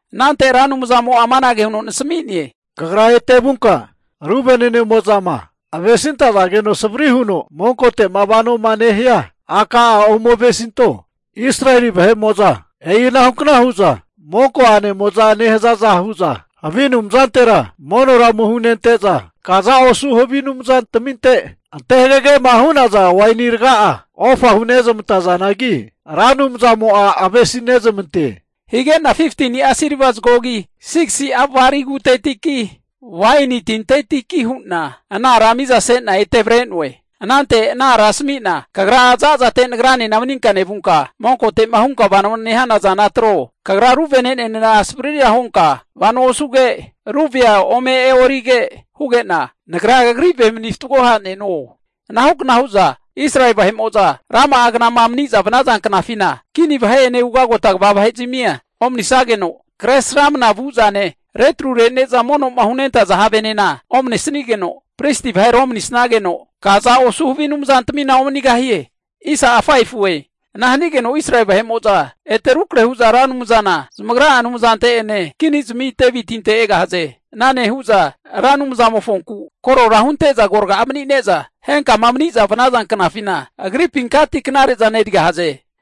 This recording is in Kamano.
Anante Ra Anumzamo'a amanage huno nasami'ne, Kagra ete vunka ru vene'nemo'zama avesintazageno savri huno monkote'ma vanoma nehia a'ka'a ome avesinto. Israeli vahe'mo'za e'inahu kna hu'za monko a'nemo'za nehazaza hu'za havi anumzantera monora ome hunente'za, kaza osu havi anumzantaminte ante hagagema hu'naza waini raga'a ofa hunezmantazanagi, Ra Anumzamo'na navesinezmantoe. Higena 15'a silva zagogi, 6'a bali kutetiki, waini tintetiki hu'na ana ara mizasena ete avre'noe. Anante ana ara asami'na, kagra zazate nagranena maninka nevunka, monkote'ma hunka vano nehana zana atro. Kagra ru vene'nenena savrira hunka vano osuge, ru vea ome e'orige huge'na, nagra kagri ve mani fatgo ha'neno. Ana hukna hu'za Israeli vahe'mo'za rama'a knama mani'za vanaza knafina, kini vahe'ene ugagota kva vahezmia omanisageno, kresramana vu zane, retru rene'za mono'ma hunentaza havenena omanesigeno, pristi vahera omanisageno, kaza osu havi anumzantamina omanegahie. Ana hanigeno Israeli vahe'mo'za ete rukrahe hu'za Ra Anumzana zamagra'a Anumzante'ene kinizmi Devitinte'ene egahaze. Ana nehu'za Ra Anumzamofonku korora hunte'za agoraga'a mani'neza, henkama maniza vanaza knafina Agripinkati knare'zana erigahaze.